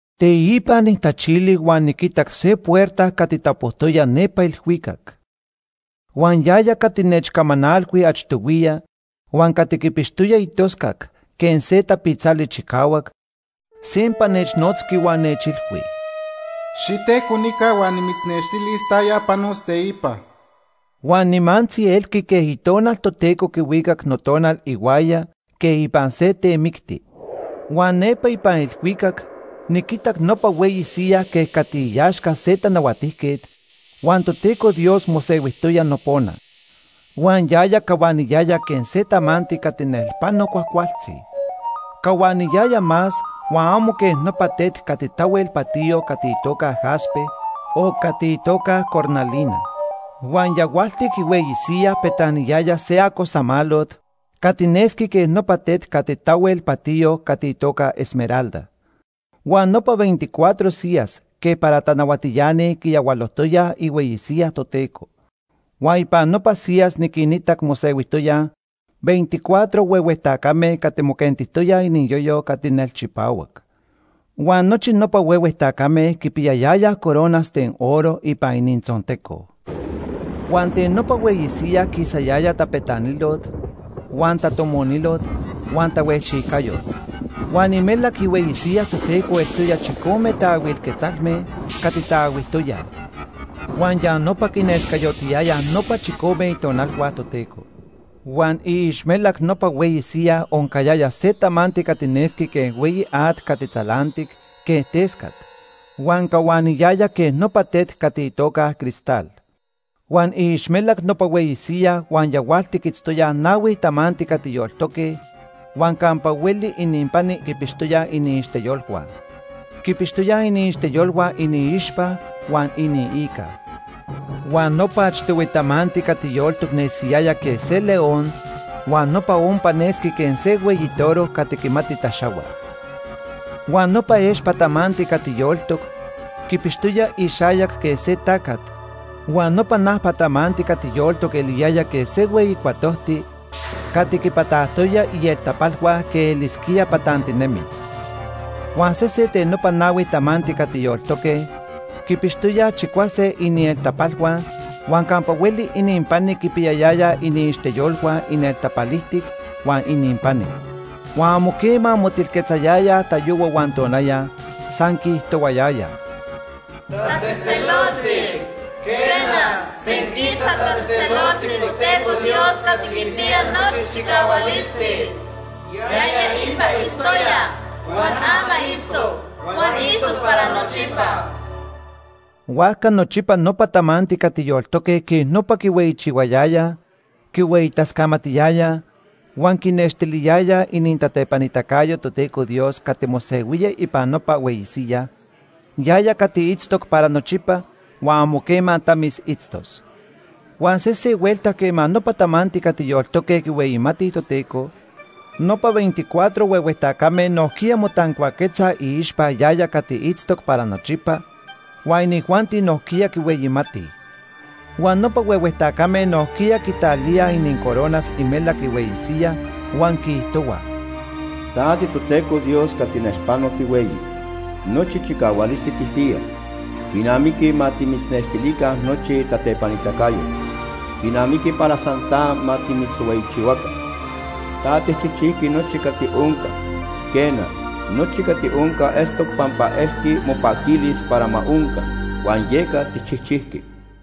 Teipa nijtachili huan niquitac se puerta cati tapojtoya nepa ilhuicac. Huan yaya cati nechcamanalhui achtohuiya huan cati quipixtoya itoscac quej se tapitzali chicahuac, sempa nechnotzqui huan nechilhui: “Xitejco nica huan nimitznextilis taya panos teipa.” Huan nimantzi elqui quej Itonal Toteco quihuicac notonal ihuaya quej ipan se temicti. Huan nepa ipan ilhuicac niquitac nopa hueyi siyaj quej cati iaxca se tanahuatijquet, huan Toteco Dios mosehuijtoya nopona. Huan yaya cahuaniyaya quej se tamanti cati nelpano cuajcualtzi. Cahuaniyaya más huan amo quej nopa tet cati tahuel patiyo cati itoca jaspe o cati itoca cornalina. Huan yahualtic ihueyi siyaj petaniyaya se acosamalot cati nesqui quej nopa tet cati tahuel patiyo cati itoca esmeralda. Huan nopa veinticuatro siyas quej para tanahuatiani quiyahualojtoyaj ihueyi siyaj Toteco. Huan ipan nopa siyas niquinitac mosehuijtoyaj veinticuatro huehue tacame cati moquentijtoyaj iniyoyo cati nelchipahuac. Huan nochi nopa huehue tacame quipiyayayaj coronas ten oro ipan inintzonteco. Huan ten nopa hueyi siyaj quisayaya tapetanilot huan tatomonilot huan tahuejchijcayot. Huan imelac ihueyi siyaj Toteco eltoya chicome taahuil quetzalme cati taahuijtoyaj. Huan ya quinescayotiyayaj nopa chicome itonalhua Toteco. Huan iixmelac nopa hueyi siyaj oncayaya se tamanti cati nesqui quej hueyi at cati tzalantic quej tescat huan cahuaniyaya quej nopa tet cati itoca cristal. Huan iixmelac nopa hueyi siyaj huan yahualtic itztoyaj nahui tamanti cati yoltoque huan campa hueli ininpani quipixtoyaj iniixteyolhua. Quipixtoyaj iniixteyolhua iniixpa huan iniica. Huan nopa achtohui tamanti cati yoltoc nesiyaya quej se león huan nopa ompa nesqui quej se hueyi toro cati quimati taxahua. Huan nopa expa tamanti cati yoltoc quipixtoya ixayac quej se tacat, huan nopa najpa tamanti cati yoltoc eliyaya quej se hueyi cuatojti cati quipatajtoya ieltapalhua quej elisquía patantinemi. Huan sesen ten nopa nahui tamanti cati yoltoque quipixtoyaj chicuase inieltapalhua huan campa hueli ininpani quipiyayayaj iniixteyolhua inieltapalijtic huan ininpani. Huan amo quema motilquetzayayaj tayohua huan tonaya, san quiijtohuayayaj: “Tatzejtzeloltic, quena, senquisa tatzejtzeloltic Toteco Dios Cati Quipiya Nochi Chicahualisti. Yaya ipa itztoya, huan ama itztoc, huan itztos para nochipa.” Huajca nochipa nopa tamanti cati yoltoque quej nopa quihueyichihuayayaj, quihueyitascamatiyayaj huan quinextiliyayaj inintatepanitacayo Toteco Dios cati mosehuía ipan nopa hueyi siyaj, yaya cati itztoc para nochipa huan amo quema tamis itztos. Huan sese huelta quema nopa tamanti cati yoltoque quihueyimatij Toteco, nopa veinticuatro huehue tacame nojquiya motancuaquetzaj iixpa yaya cati itztoc para nochipa, huan inijuanti nojquiya quihueyimatij. Huan nopa huehue tacame nojquiya quitalíaj inincoronas imelac ihueyi siyaj huan quiijtohuaj: “Ta tiToteco Dios cati nelpano tihueyi. Nochi chicahualisti tijpiya. Quinamiqui ma timitznextilica nochi tatepanitacayot. Quinamiqui para san ta ma timitzhueyichihuaca. Ta tijchijchijqui nochi cati onca. Quena, nochi cati onca eltoc pampa elqui mopaquilis para ma onca, huan yeca tijchijchijqui.”